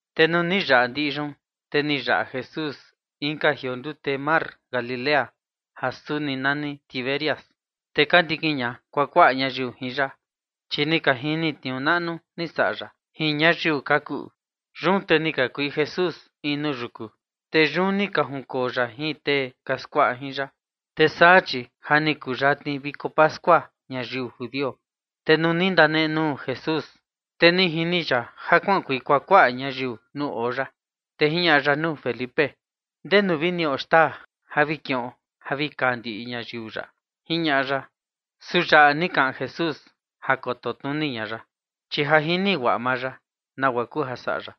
Te nuu ni yaꞌa ndiꞌi yun, te ni yaꞌa Jesús inka jioo ndute mar Galilea ja suni nani Tiberias. Te ka ndikin ña kuakuaꞌa ñayiu jin ya, chi ni ka jini tniuu naꞌnu ni saꞌa ya jin ñayiu ka kuꞌu. Yun te ni kakuei Jesús in nuu yuku, te yun ni ka junkoo ya jin tee ka skuaꞌa jin ya. Te saa chi ja ni kuyatni viko pascua ñayiu judio. Te nuu ni ndanenuu Jesús, te ni jini ya ja kuaꞌankuei kuakuaꞌa ñayiu nuu oo ya, te jiñaꞌa ya nuu Felipe: ―¿Ndenu vi niꞌo xtaa vi kiꞌon ja vi kaa ndiꞌi ñayiu yaꞌa? ―jiñaꞌa ya. Su yaꞌa ni kaꞌan Jesús ja koto tnuni ña ya, chi ja jini guaꞌa maa ya nagua kuu ja saꞌa ya.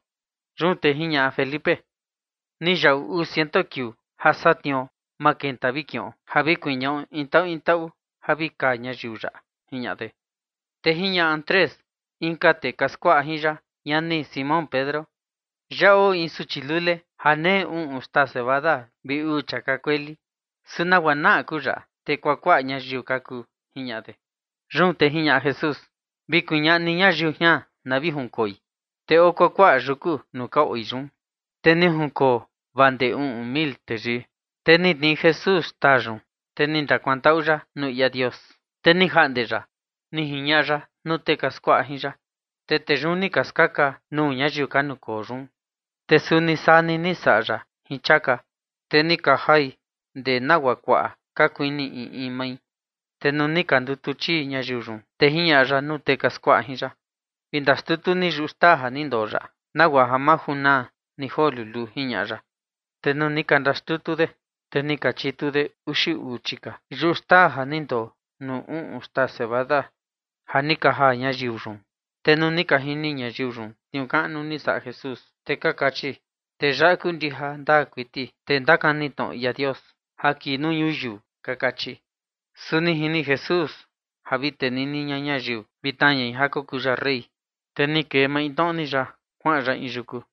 Yun te jiñaꞌa Felipe: ―Ni yaꞌu uu ciento kiuu ja satniuo ma kenta vi kiꞌon ja vi kuñaꞌo in taꞌu in taꞌu ja vi kaa ñayiu yaꞌa ―jiñaꞌa de. Te jiñaꞌa Andrés, inka tee ka skuaꞌa jin ya, ñani Simón Pedro: ―Yaꞌa oo in suchi lule ja nei uꞌun xtaa cebada vi uu chiaka kueli, ¿su nagua naꞌa kuu yaꞌa, te kuakuaꞌa ñayiu ka kuu? ―jiñaꞌa de. Yun te jiñaꞌa Jesús: ―Vi kuñaꞌa ni ñayiu jian na vi junkoi. Te oo kuakuaꞌa yuku nuu ka oi yun, te ni ka junkoo vaa ndee uꞌun mil teyii. Te ni tnii Jesús xtaa yun, te ni ndakuantaꞌu ya nuu ia Dios, te ni jaꞌnde ya ni jiñaꞌa ya nuu tee ka skuaꞌa jin ya, te tee yun ni ka skaka nuu ñayiu ka nukoo yun. Te suni saa ni ni saꞌa ya jin chiaka, te ni ka jai ndee nagua kuaꞌa ka kuini in in mai. Te nuu ni ka ndutu chii ñayiu yun, te jiñaꞌa ya nuu tee ka skuaꞌa jin ya: ―Vi ndaxtutu ni yuꞌu xtaa ja ni ndoo yaꞌa nagua ja ma junaa ni joo luluu ―jiñaꞌa ya. Te nuu ni ka ndaxtutu de, te ni ka chitu de uxi uu chika yuꞌu xtaa ja ni ndoo nuu uꞌun xtaa cebada ja ni ka jaa ñayiu yun. Te nuu ni ka jini ñayiu yun tniuu kaꞌnu ni saꞌa Jesús, te ka kachi: ―Tee yaꞌa kuu ndija ndaa kuiti tee ndakani tnoꞌo ia Dios ja kii nuu ñuyiu ―ka kachi. Su ni jini Jesús ja vi tenini ña ñayiu vi tnaa ñai ja kokuu ya rey, te ni kee maintnoꞌo ni ya kuaꞌan ya in yuku.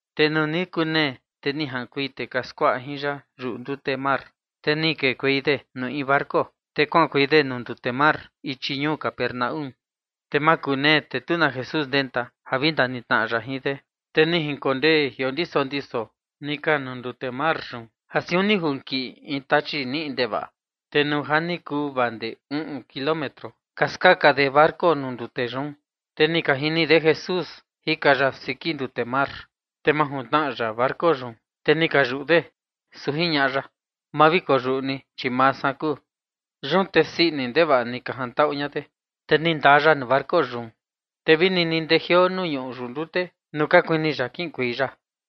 Te nuu ni kunee, te ni jaꞌankuei tee ka skuaꞌa jin ya yuꞌu ndute mar. Te ni kekuei de nuu in barco, te kuaꞌankuei de nuu ndute mar ichi ñuu Capernaúm. Te ja makunee, te tu na Jesús ndenta ja vi ndanitnaꞌa ya jin de. Te ni jinkondee jiondiso ndiso ni ka nuu ndute mar yun ja siun ni junkiꞌi in tachi niꞌi ndevaꞌa. Te nuu ja ni kuu vaa ndee uꞌun kilómetro ka skaka de barco nuu ndute yun, te ni ka jini de Jesús jika ya siki ndute mar, te majuntnaꞌa ya barco yun, te ni ka yuꞌu de. Su jiñaꞌa ya: ―Ma vi koyuꞌu ni, chi maa san kuu. Yun te sii ini ndevaꞌa ni ka jantaꞌu ña de, te ni ndaa ya nuu barco yun. Te vini ni ndejioo nuu ñuꞌu yuꞌu ndute nuu ka kuini ya kiꞌinkuei ya.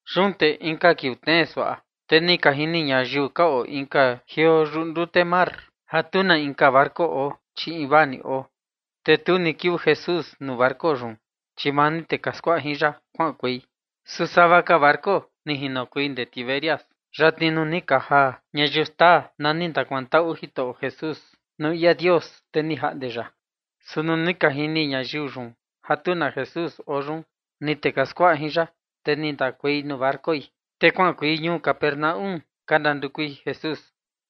Yun te inka kiuu tnee suaꞌa, te ni ka jini ñayiu ka oo inka jioo yuꞌu ndute mar ja tu na inka barco oo, chi invaa ni oo, te tu ni kiuu Jesús nuu barco yun, chi maa ni tee ka skuaꞌa jin ya kuaꞌankuei. Su sava ka barco ni jinokuei ndee Tiberias, yatni nuu ni ka jaa ñayiu xtaa na ni ndakuantaꞌu Jitoꞌo Jesús nuu ia Dios, te ni jaꞌnde ya. Su nuu ni ka jini ñayiu yun ja tu na Jesús oo yun, ni tee ka skuaꞌa jin ya, te ni ndakuei nuu barcoi, te kuaꞌankuei ñuu Capernaúm ka ndandukui Jesús.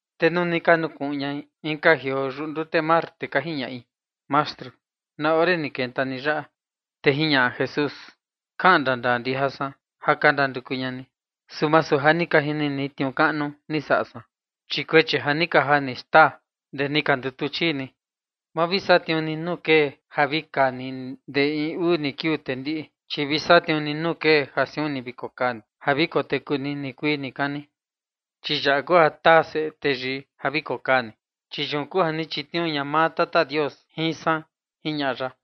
Te nuu ni ka nukuꞌun ñai inka jioo yuꞌu ndute mar, te ka jiñaꞌi: ―Mastru, ¿na ore ni kenta ni yaꞌa? Te jiñaꞌa Jesús: ―Kaꞌan ndandaa ndija san ja ka ndanduku ña ni, su masu ja ni ka jini ni tniuu kaꞌnu ni saꞌa san, chi chia ni ka jaa ni xtaa guaa ndee ni ka ndutu chii ni. Ma vi satniuu ni nuu kee ja vi kaa ni ndee in uu ni kiuu te ndiꞌi, chi vi satniuu ni nuu kee ja siun ni vi kokaa ni ja vi koteku ni nikuii nikani. Chi yaꞌa kuu ja taa Seꞌe Teyii ja vi kokaa ni, chi yun kuu ja ni chitniuu ña maa Tata Dios jin san ―jiñaꞌa ya.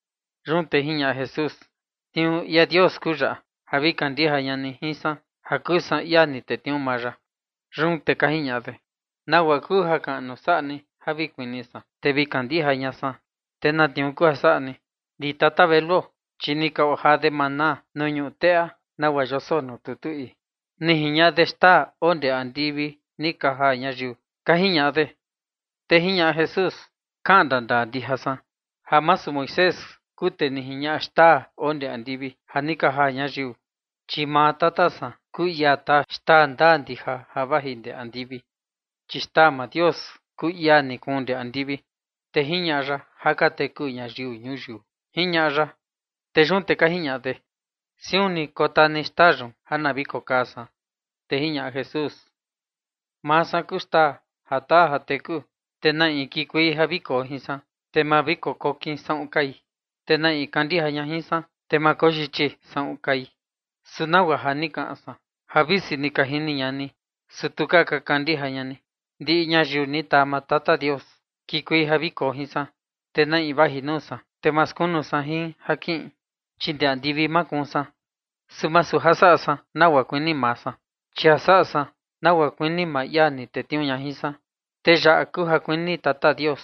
Yun te jiñaꞌa Jesús: ―Tniuu ia Dios kuu yaꞌa, ja vi kandija ña ni jin san ja kuu san ia ni tetniuu maa ya. Yun te ka jiñaꞌa de: ―¿Nagua kuu jakaꞌnu saꞌa ni ja vi kuni san, te vi kandija ña san? ¿Te na tniuu kuu ja saꞌa ni? Ndi tata veluo, chi ni ka ojaa de maná nuu ñuꞌu teꞌa, nagua yoso nuu tutu ii: “Ni jiñaꞌa de xtaa oo ndee andivi ni ka jaa ñayiu” ―ka jiñaꞌa de. Te jiñaꞌa Jesús: ―Kaꞌan ndandaa ndija san, ja masu Moisés kuu tee ni jiñaꞌa xtaa oo ndee andivi ja ni ka jaa ñayiu, chi maa Tata san kuu ia taa xtaa ndaa ndija ja vaji ndee andivi. Chi xtaa maa Dios kuu ia ni kuun ndee andivi, te jiñaꞌa ya ja ka teku ñayiu ñuyiu ―jiñaꞌa ya. Yun te ka jiñaꞌa de: ―Siun ni kotaa ni xtaa yun ja na vi kokaa san. Te jiñaꞌa Jesús: ―Maa san kuu xtaa ja taa ja teku. Te na in kikuei ja vi koo jin san, te ma vi kokokin saꞌun kai, te na in kandija ña jin san, te ma koyichi saꞌun kai. Su nagua ja ni kaꞌan san ja visi ni ka jini ña ni, su tu ka kandija ña ni. Ndiꞌi ñayiu ni taa maa Tata Dios kikuei ja vi koo jin san, te na in vaji nuu san, te ma skunu san jin ja kiꞌin. Chi ndee andivi makuun san, su masu ja saꞌa san nagua kuini maa san, chi ja saꞌa san nagua kuini maa ia ni tetniuu ña jin san. Te yaꞌa kuu ja kuini Tata Dios,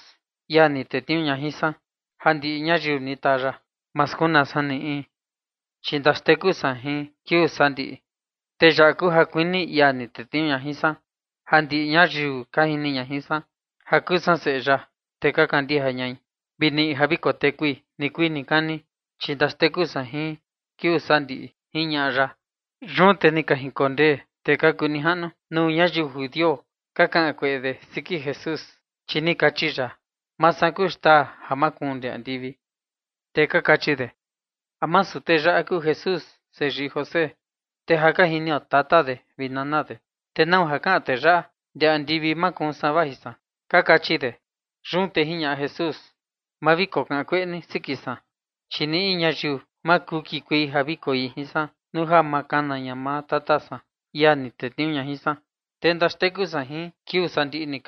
ia ni tetniuu ña jin san, ja ndiꞌi ñayiu ni taa ya, ma skunaa san ni in, chi ndaxteku san jin kiuu sandiꞌi. Te yaꞌa kuu ja kuini ia ni tetniuu ña jin san, ja ndiꞌi ñayiu ka jini ña jin san ja kuu san Seꞌe ya, te ka kandija ñai, vi niꞌi ja vi kotekui nikuii nikani, chi ndaxteku san jin kiuu sandiꞌi ―jiñaꞌa ya. Yun te ni ka jinkondee tee ka kuu nijaꞌnu nuu ñayiu judio, ka kaꞌan kueꞌe de siki Jesús, chi ni kachi ya: “Maa san kuu xtaa ja makuun ndee andivi”. Te ka kachi de: ―¿A masu tee yaꞌa kuu Jesús, seyii José? Te ja ka jinio tata de vi nana de, ¿te nau ja kaꞌan tee yaꞌa: “Ndee andivi makuun san vaji san”? ―ka kachi de. Yun te jiñaꞌa Jesús: ―Ma vi kokaꞌan kueꞌe ni siki san. Chi ni in ñayiu ma kuu kikuei ja vi koi jin san nuu ja ma kana ña maa Tata san, ia ni tetniuu ña jin san, te ndaxteku san jin kiuu sandiꞌi.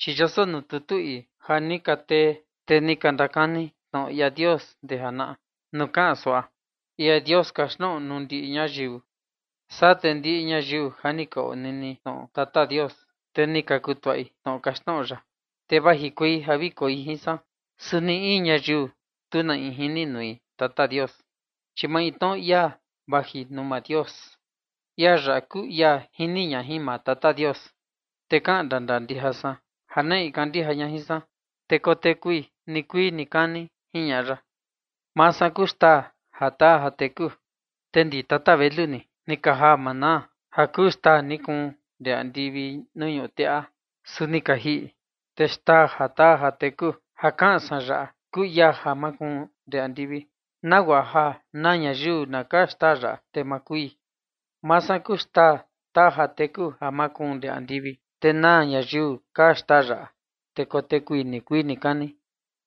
Chi yoso nuu tutu ii ja ni ka tee tee ni ka ndakani tnoꞌo ia Dios ndee janaꞌa nuu kaꞌan suaꞌa: “Ia Dios kaxtnoꞌo nuu ndiꞌi ñayiu”. Saa te ndiꞌi ñayiu ja ni ka onini tnoꞌo Tata Dios, te ni ka kutuꞌai tnoꞌo kaxtnoꞌo ya, te vajikuei ja vi koi jin san. Su ni in ñayiu tu na in jini nui Tata Dios, chi maintnoꞌo ia vaji nuu maa Dios, ia yaꞌa kuu ia jini ña jin maa Tata Dios. Te kaꞌan ndandaa ndija san ja na in kandija ña jin san, te kotekui nikuii nikani ―jiñaꞌa ya. ’Maa san kuu xtaa ja taa ja teku. Te ndi tata velu ni, ni ka jaa maná ja kuu xtaa ni kuun ndee andivi nuu ñuꞌu teꞌa, su ni ka jiꞌi. Te xtaa ja taa ja teku ja kaꞌan san yaꞌa kuu ia ja makuun ndee andivi, nagua ja na ñayiu na kaa xtaa yaꞌa, te ma kui. Maa san kuu xtaa taa ja teku ja makuun ndee andivi, te na ñayiu kaa xtaa yaꞌa, te kotekui nikuii nikani.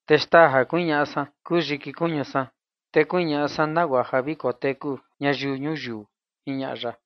Te xtaa ja kuñaꞌa san kuu yiki kuñu san, te kuñaꞌa san nagua ja vi koteku ñayiu ñuyiu ―jiñaꞌa ya.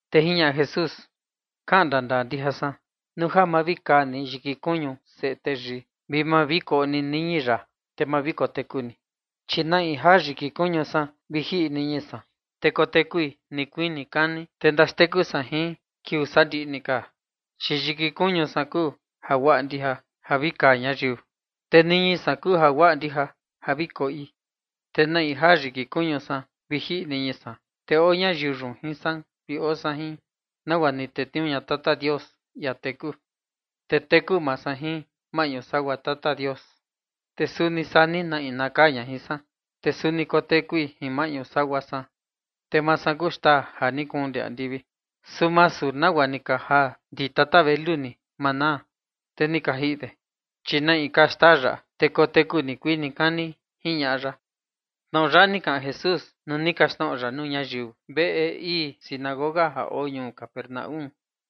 Te jiñaꞌa Jesús: ―Kaꞌan ndandaa ndija san, nuu ja ma vi kaa ni yiki kuñu Seꞌe Teyii, vi ma vi koꞌo ni niñi ya, te ma vi koteku ni. Chi na in jaa yiki kuñu san vi jiꞌi niñi san, te kotekui nikuii nikani, te ndaxteku san jin kiuu sandiꞌi. Chi yiki kuñu san kuu jaguaꞌa ndija ja vi kaa ñayiu, te niñi san kuu jaguaꞌa ndija ja vi koꞌi. Te na in jaa yiki kuñu san vi jiꞌi niñi san, te oo ñayiu yun jin san vi oo san jin. Nagua ni tetniuu ña Tata Dios, ia teku, te teku maa san jin maꞌñu sagua Tata Dios, te suni saa ni na in na kaa ña jin san, te suni kotekui jin maꞌñu sagua san. Te maa san kuu xtaa ja ni kuun ndee andivi, su masu nagua ni ka jaa ndi tata velu ni maná, te ni ka jiꞌi de, chi na in kaa xtaa yaꞌa, te kotekui nikuii nikani ―jiñaꞌa ya. Tnoꞌo yaꞌa ni kaꞌan Jesús nuu ni kaxtnoꞌo ya nuu ñayiu veꞌe ii sinagoga ja oo ñuu Capernaúm.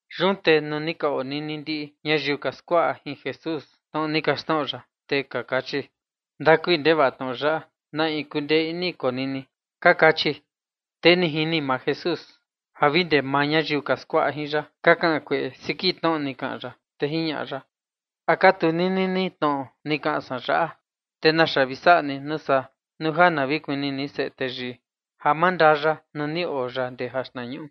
Yun te nuu ni ka onini ndiꞌi ñayiu ka skuaꞌa jin Jesús tnoꞌo ni kaxtnoꞌo ya, te ka kachi: ―Ndakui ndevaꞌa tnoꞌo yaꞌa, ¿na in kundee ini konini? ―ka kachi. Te ni jini maa Jesús ja vi ndee maa ñayiu ka skuaꞌa jin ya ka kaꞌan kueꞌe siki tnoꞌo ni kaꞌan ya, te jiñaꞌa ya: ―¿A ka tunini ni tnoꞌo ni kaꞌan san yaꞌa? Te ¿naxa vi saꞌa ni nuu saa, nuu ja na vi kuni ni Seꞌe Teyii ja mandaa ya nuu ni oo ya ndee jaxtnañuꞌu?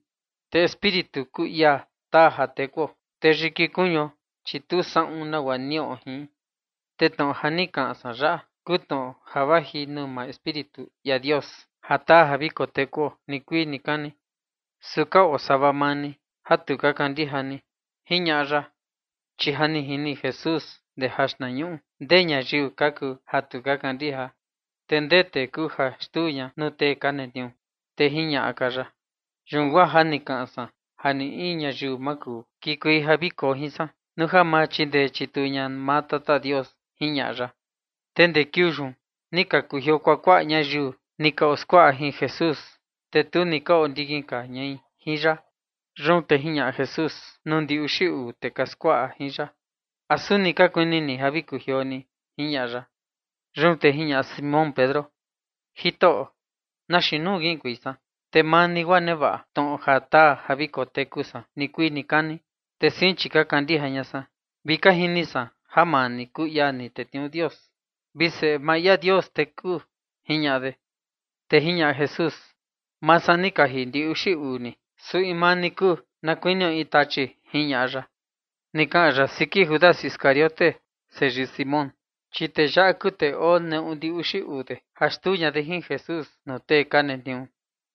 Te Espíritu kuu ia taa ja tekuo, te yiki kuñuo, chi tu saꞌun nagua niꞌo jin. Te tnoꞌo ja ni kaꞌan san yaꞌa kuu tnoꞌo ja vaji nuu maa Espíritu ia Dios ja taa ja vi kotekuo nikuii nikani. Su ka oo sava maa ni ja tu ka kandija ni ―jiñaꞌa ya. Chi ja jini Jesús ndee jaxtnañuꞌu ndee ñayiu ka kuu ja tu ka kandija, te ndee tee kuu ja xtuu ña nuu tee ka netniuu. Te jiñaꞌa ka ya: ―Yun guaa ja ni kaꞌan san ja ni in ñayiu ma kuu kikuei ja vi koo jin san nuu ja ma chindee chituu ña maa Tata Dios ―jiñaꞌa ya. Te ndee kiuu yun ni ka kujioo kuakuaꞌa ñayiu ni ka oskuaꞌa jin Jesús, te tu ni ka ondikin ka ñai jin ya. Yun te jiñaꞌa Jesús nuu ndi uxi uu tee ka skuaꞌa jin ya: ―¿A suni ka kuini ni ja vi kujioo ni? ―jiñaꞌa ya. Yun te jiñaꞌa Simón Pedro: ―Jitoꞌo, ¿na xiin nuu kiꞌinkuei san? Te maa ni guaa nevaꞌa tnoꞌo ja taa ja vi koteku san nikuii nikani. Te sein, chi ka kandija ña san vi ka jini san ja maa ni kuu ia ni tetniuu Dios vi Seꞌe maa ia Dios teku ―jiñaꞌa de. Te jiñaꞌa Jesús: ―Maa san ni kaji ndi uxi uu ni, su in maa ni kuu ni na kuinio in tachi ―jiñaꞌa ya. Ni kaꞌan ya siki Judas Iscariote, seyii Simón, chi tee yaꞌa kuu tee oo neꞌu ndi uxi uu de ja xtuu ña de jin Jesús nuu tee ka netniuu.